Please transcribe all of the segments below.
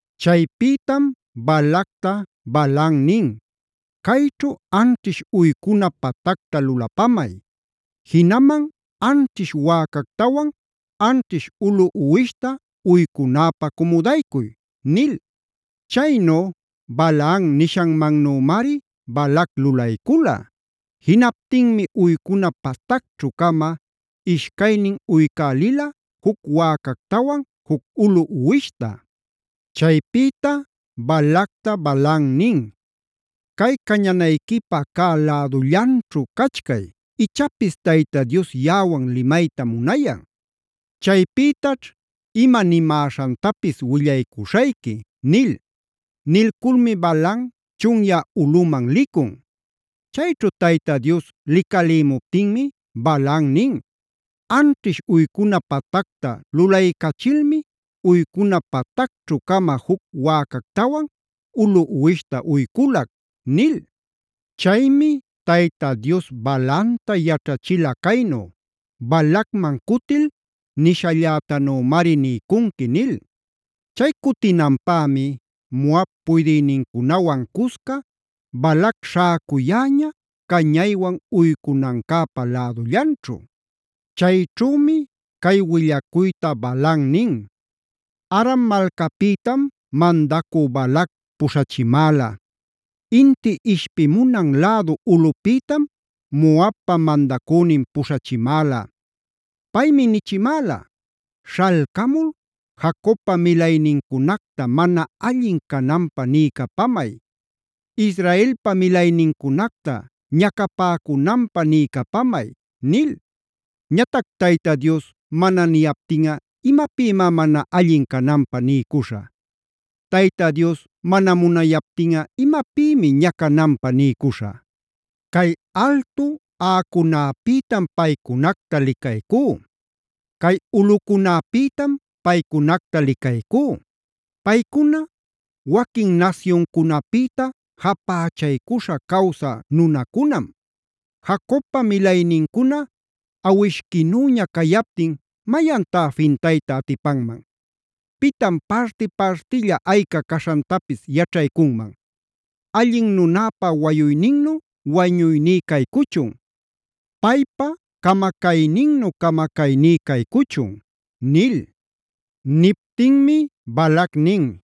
Chaypïtam Balacta Balaam nin: “Cayćhu anćhish uycuna patacta lulapamay; jinaman anćhish wäcactawan anćhish ulu uwishta uycunäpä cumudaycuy” nil. Chaynu Balaam nishanmannümari Balac lulaycula. Jinaptinmi uycuna patacćhü-cama ishcaynin uycälila juc wäcactawan, juc ulu uwishta. Chaypïta Balacta Balaam nin: “Cay cañanayquipä cä lädullanćhu cachcay, ichapis Tayta Dios yaꞌawan limayta munayan. Chaypïtaćh ima nimäśhantapis willaycuśhayqui” nil. Nilculmi Balaam chunyä ulꞌuman licun. Chayćhu Tayta Dios licalïmuptinmi Balaam nin: “Anćhish uycuna patacta lulaycachilmi uycuna patacćhü-cama juc wäcactawan ulu uwishta uyculac” nil. Chaymi Tayta Dios Balaamta yaćhachila caynu: “Balacman cutil nishallätanümari niycunqui” nil. Chay cutinanpämi Moab puydïnincunawan cusca Balac śhäcuyäña cañaywan uycunancäpa lädullanćhu. Chayćhümi cay willacuyta Balaam nin: “Aram malcapïtam mandacü Balac puśhachimäla; inti ishpimunan lädu ulꞌupïtam Moabpa mandacünin puśhachimäla. Paymi nichimäla: ‘Śhalcamul Jacobpa milaynincunacta mana allin cananpä niycapamay; Israelpa milaynincunacta ñacapäcunanpä niycapamay’ nil. Ñatac ¿Tayta Dios mana niyaptinꞌa imapïmá mana allin cananpä niycuśhä? ¿Tayta Dios mana munayaptinꞌa imapïmi ñacananpä niycuśhä? Cay altu aꞌacunäpïtam paycunacta licaycú; cay ulꞌucunäpïtam paycunacta licaycú. Paycuna waquin nasyuncunapïta japächaycuśha cawsä nunacunam. Jacobpa milaynincuna awishquinüña cayaptin ¿mayantá fintayta atipanman? ¿Pitan parti-partilla ayca caśhantapis yaćhaycunman? Allin nunäpa wañuyninnu wañuyní caycuchun; Paypa camacayninnu camacayní caycuchun” nil. Niptinmi Balac nin: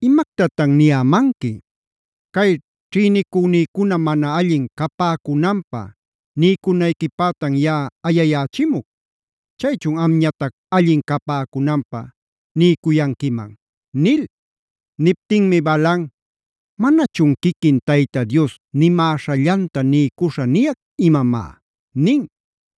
“¿Imactatan niyämanqui? Cay ćhïnicüniquicuna mana allin capäcunanpä niycunayquipätan yaꞌa ayayächimuc. Chaychun amñatac allin capäcunanpä niycuyanquiman” nil. Niptinmi Balaam: “¿Manachun quiquin Tayta Dios nimäśhallanta niycuśha niyac imamá?” nin.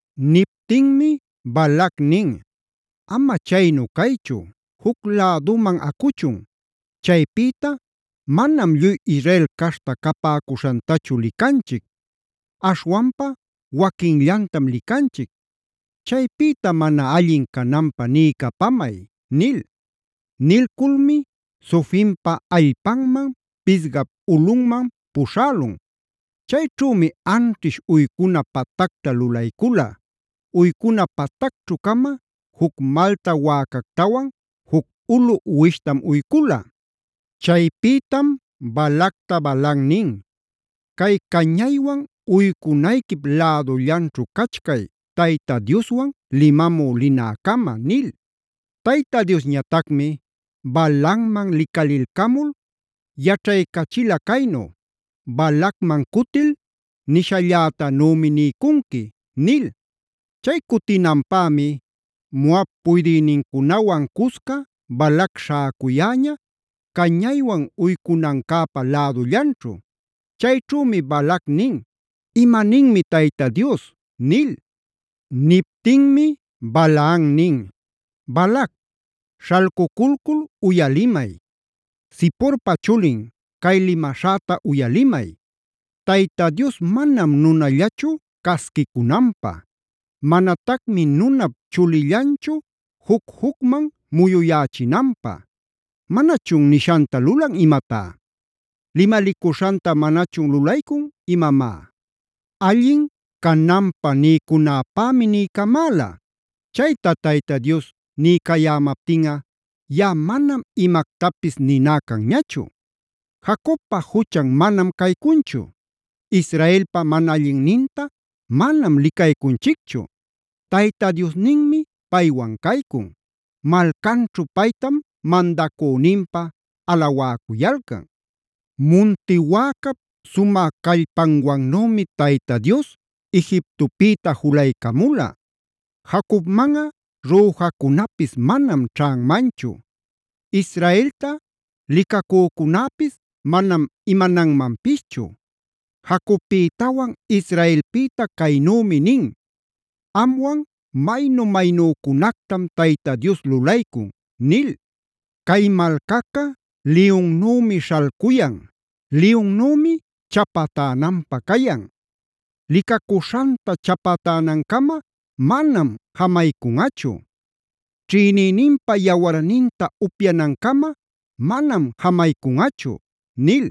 Niptinmi Balac nin: “Ama chaynu caychu, juc läduman acuchun. Chaypïta manam lluy Israel caśhta capäcuśhantachu licanchic; aśhwanpa waquinllantam licanchic. Chaypïta mana allin cananpä niycapamay” nil. Nilculmi Zofimpa allpanman Pisgap ulꞌunman puśhälun. Chayćhümi anćhish uycuna patacta lulaycula; uycuna patacćhü-cama juc malta wäcactawan juc ulu uwishtam uycula. Chaypïtam Balacta Balaam nin: “Cay cañaywan uycunayquip lädullanćhu cachcay, Tayta Dioswan limamü linäcama” nil. Tayta Diosñatacmi Balaamman licalilcamul yaćhaycachila caynu: “Balacman cutil nishallätanümi niycunqui” nil. Chay cutinanpämi Moab puydïnincunawan cusca Balac śhäcuyäña, cañaywan uycunancäpa lädullanćhu. Chayćhümi Balac nin: “¿Imaninmi Tayta Dios?” nil. Niptinmi Balaam nin: “Balac, śhalcuculcul uyalimay; Ziporpa chulin, cay limaśhäta uyalimay. Tayta Dios manam nunallachu casquicunanpä; manatacmi nunap chulillanchu juc-jucman muyuyächinanpä. ¿Manachun nishanta lulan imatá? ¿Limalicuśhanta manachun lulaycun imamá? Allin cananpä niycunäpämi niycamäla; chayta Tayta Dios niycayämaptinꞌa, yaꞌa manam imactapis niná canñachu. Jacobpa juchan manam caycunchu; Israelpa mana allinninta manam licaycunchicchu. Tayta Diosninmi paywan caycun; malcanćhu paytam mandacüninpä alawäcuyalcan. Munti wäcap sumä callpanwannümi Tayta Dios Egiptopïta julaycamula. Jacobmanꞌa rüjacunapis manam ćhanmanchu; Israelta licacücunäpis manam imananmanpischu. Jacobpïtawan Israelpïta caynümi nin: ‘Amwan maynu-maynücunactam Tayta Dios lulaycun’ nil. Cay malcaca liyunnümi śhalcuyan; liyunnümi chapatänanpä cayan. Licacuśhanta chapatänancama manam jamaycunꞌachu; ćhïnïninpa yawarninta upyanancama manam jamaycunꞌachu” nil.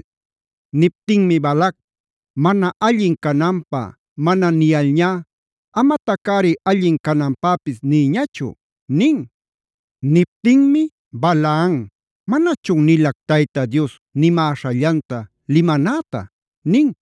Niptinmi Balac: “Mana allin cananpä mana niyalñá, amatacꞌari allin cananpäpis niyñachu” nin. Niptinmi Balaam: “¿Manachun nilac Tayta Dios nimäśhallanta limanäta?” nin.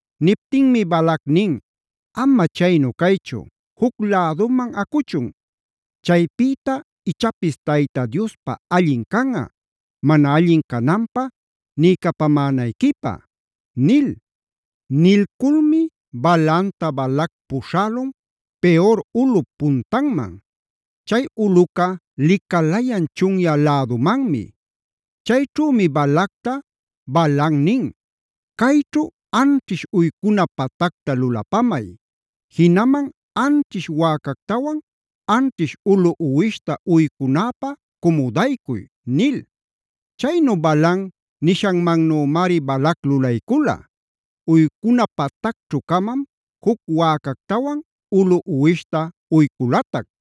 Niptinmi Balac nin: “Ama chaynu caychu, juc läduman acuchun. Chaypïta ichapis Tayta Diospa allin canꞌa; mana allin cananpä niycapamänayquipä” nil. Nilculmi Balaamta Balac puśhälun Peor ulꞌup puntanman; chay ulꞌuca licalayan chunyä lädumanmi. Chayćhümi Balacta Balaam nin: “Cayćhu anćhish uycuna patacta lulapamay; jinaman anćhish wäcactawan anćhish ulu uwishta uycunäpä cumudaycuy” nil. Chaynu Balaam nishanmannümari Balac lulaycula. Uycuna patacćhü-camam juc wäcactawan ulu uwishta uyculatac.